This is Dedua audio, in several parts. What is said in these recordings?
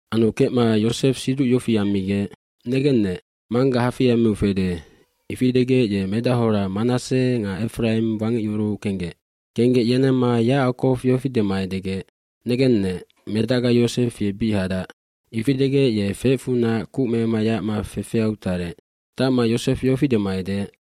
Anu kecma Yosef siduc yofi ammigec, “Negennec, mangga hafei ammiu fede.” Ifi degec ye medachora Manasse nga Efraim wangecyuruu kenggec. Kenggec yenemma Yacakow yofi dema edegec, “Negennec, medacga Yosef ye bic hadac.” Ifi degec ye feecfunac kuc mema yacma fefeau tarec. aTacma Yosef yofi dema edeec,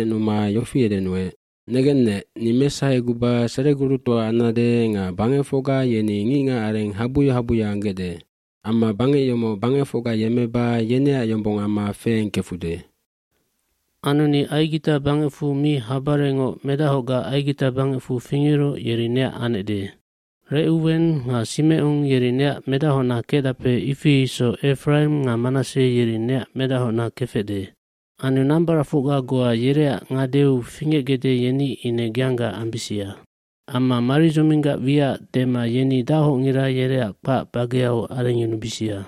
yofi edenuec, ‘Negennec, ni mesaheguba seregurutoa ambesannec nga bangecfocga yeni ngicngacareng habuya habuya anggecde. Amma bangec yomoc bangecfocga yemmeba yeneac yombong amma feengkecbesande.’ bAnu ni Aigita bangecfu mi habarengngoc medachocga Aigita bangecfu fingeroc yeri neac anecde. Recuwen nga Simecon yeri neac medachocna kecdape ifi isoc Efraim nga Manasse yeri neac medachocna kefecde. Anu nambaracfocga goa yereac ngadeu fingecgecde yeni ine geangga ambisia. Amma maridzoming nganoc dema yeni dachocngira yereac kpac bageau arengyunubisia.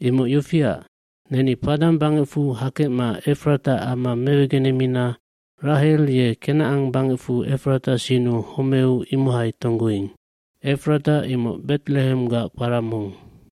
cImoc yofia, neni Paddan bangecfunac hakecma Efrata ama mewegenemina Rahel ye Kenacan bangecfu Efrata sinnu homeu imohai tonggoing.” Efrata imoc Bet Lehemgac kpara mong.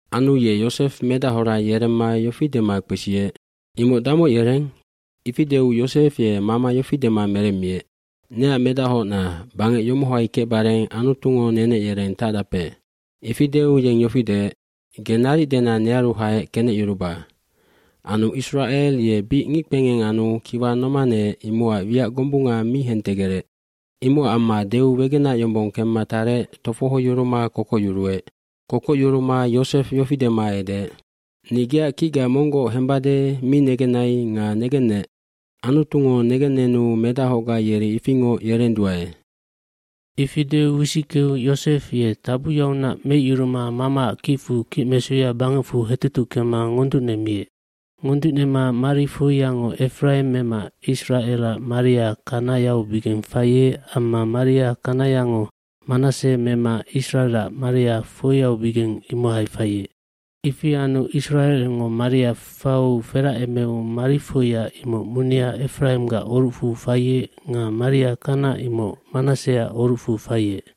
Anu ye Yosef medachora yeremma yofi dema kpesiec, “Imoc damoc yereng?” Ifi deu Yosef ye mama yofi dema meremmiec, “Neac medachocna, bangec yomohai kecbareng Anutungo nenec yereng tacdape.” Ifi deu yeng yofi deec, “Ge naric dena nearu haec kenecyuruba.” Anu Isracel ye bic ngickpengeng anu kiwa nomaneec imocac wiac gombunga mi hentegerec. Imocac amma deu wegenac yombong kemma tarec tofohoyuruma kokocyuruec. Kokocyuruma Yosef yofi dema edeec, “Ni geac kicga monggoc hembade mi negenai nga negennec, Anutungo negennenu medachocga yeri ifingoc yerenduae.” Ifi deu wisickeu Yosef ye tabuyaunac meicyuruma mamaac kicfu kicmesuya bangecfu hetutuckema ngonducnemiec. Ngonducnema marifoiyango Efraim mema Isracelac maria kanayaubigeng faiec amma maria kanayango Manasse mema Isracelac maria foiubigeng imohai faiec. dIfi anu Isracelngo maria fau feracemeu marifoiya imoc munia Efraimgac orucfu faiec nga maria kana imoc Manasseac orucfu faiec.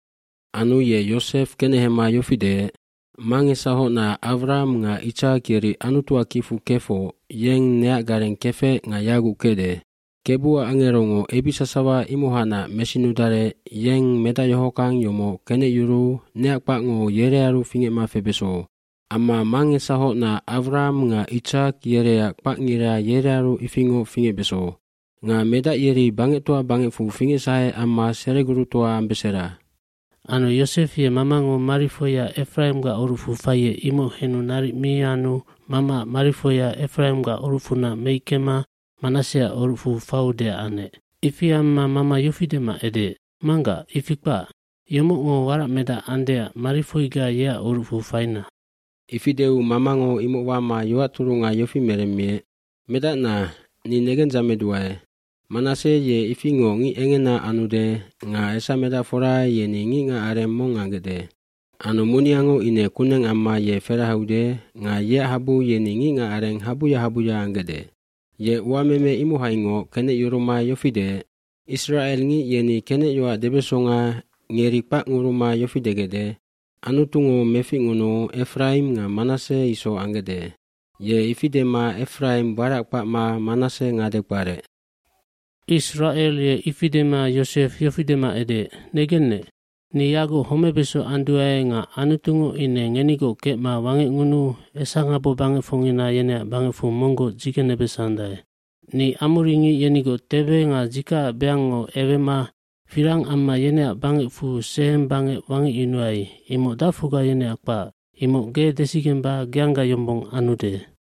eAnu ye Yosef kenehema yofi deec, “Mangesahocna Awraham nga Itsak yeri Anutuac kicfu kefoc yeng neac gareng kefec nga yaguc kecde. Kebuac angerongo ebic sasawa imohacnac mesinudarec yeng medac yohockang yomoc kenecyuruu neac kpacngo yerearu fingecma febeso. Amma mangesahocna Awraham nga Itsak yereac kpacngira yerearu ifingoc fingecbeso. Nga medac yeri bangectoa bangecfu fingecsahe amma seregurutoa ambesera.” Anu Yosef ye mamango marifoiya Efraimgac orucfu faiec imoc henu naric mi anu mamaac marifoiya Efraimgac orucfunac meickema Manasseac orucfu faudeac anec. Ifi amma mama yofi dema edeec, “Manggac, ifi kpac. Yomocngo waracmedac andeac marifoiga yeac orucfu faina.” fIfi deu mamango imoc wama yoac turunga yofi meremmiec, “Medacna, ni negendzameduae. Manasse ye ifingoc ngic engena anude nga esamedacfora yeni ngicngacareng mong ambesandae. Anu muniango ine kuneng amma ye ferahaude nga yeac habu yeni ngicngacareng habuya habuya ambesandae.” gYe uameme imohaingoc kenecyuruma yofi deec, “Isracelngic yeni kenecyoac debesonga ngeri kpacnguruma yofi degecde, ‘Anutungo meficngunuu Efraim nga Manasse isoc anggecde.’” Ye ifi dema Efraim warac kpacma Manasse ngade kparec. Isracel ye ifi dema Yosef yofi dema edeec, “Negennec, ni yaguc homebeso anduae nga Anutungo ine ngenigoc kecma wangecngunuu esangabobangecfocngina yeneac bangecfu monggoc dzigenebesandae. hNi amoringic yenigoc tebe nga dzikacac beango ewema firang amma yeneac bangecfu Sehem bangec wangecyunuai imoc dacfocga yeneac kpac, imoc ge desigemba geangga yombong ambesande.”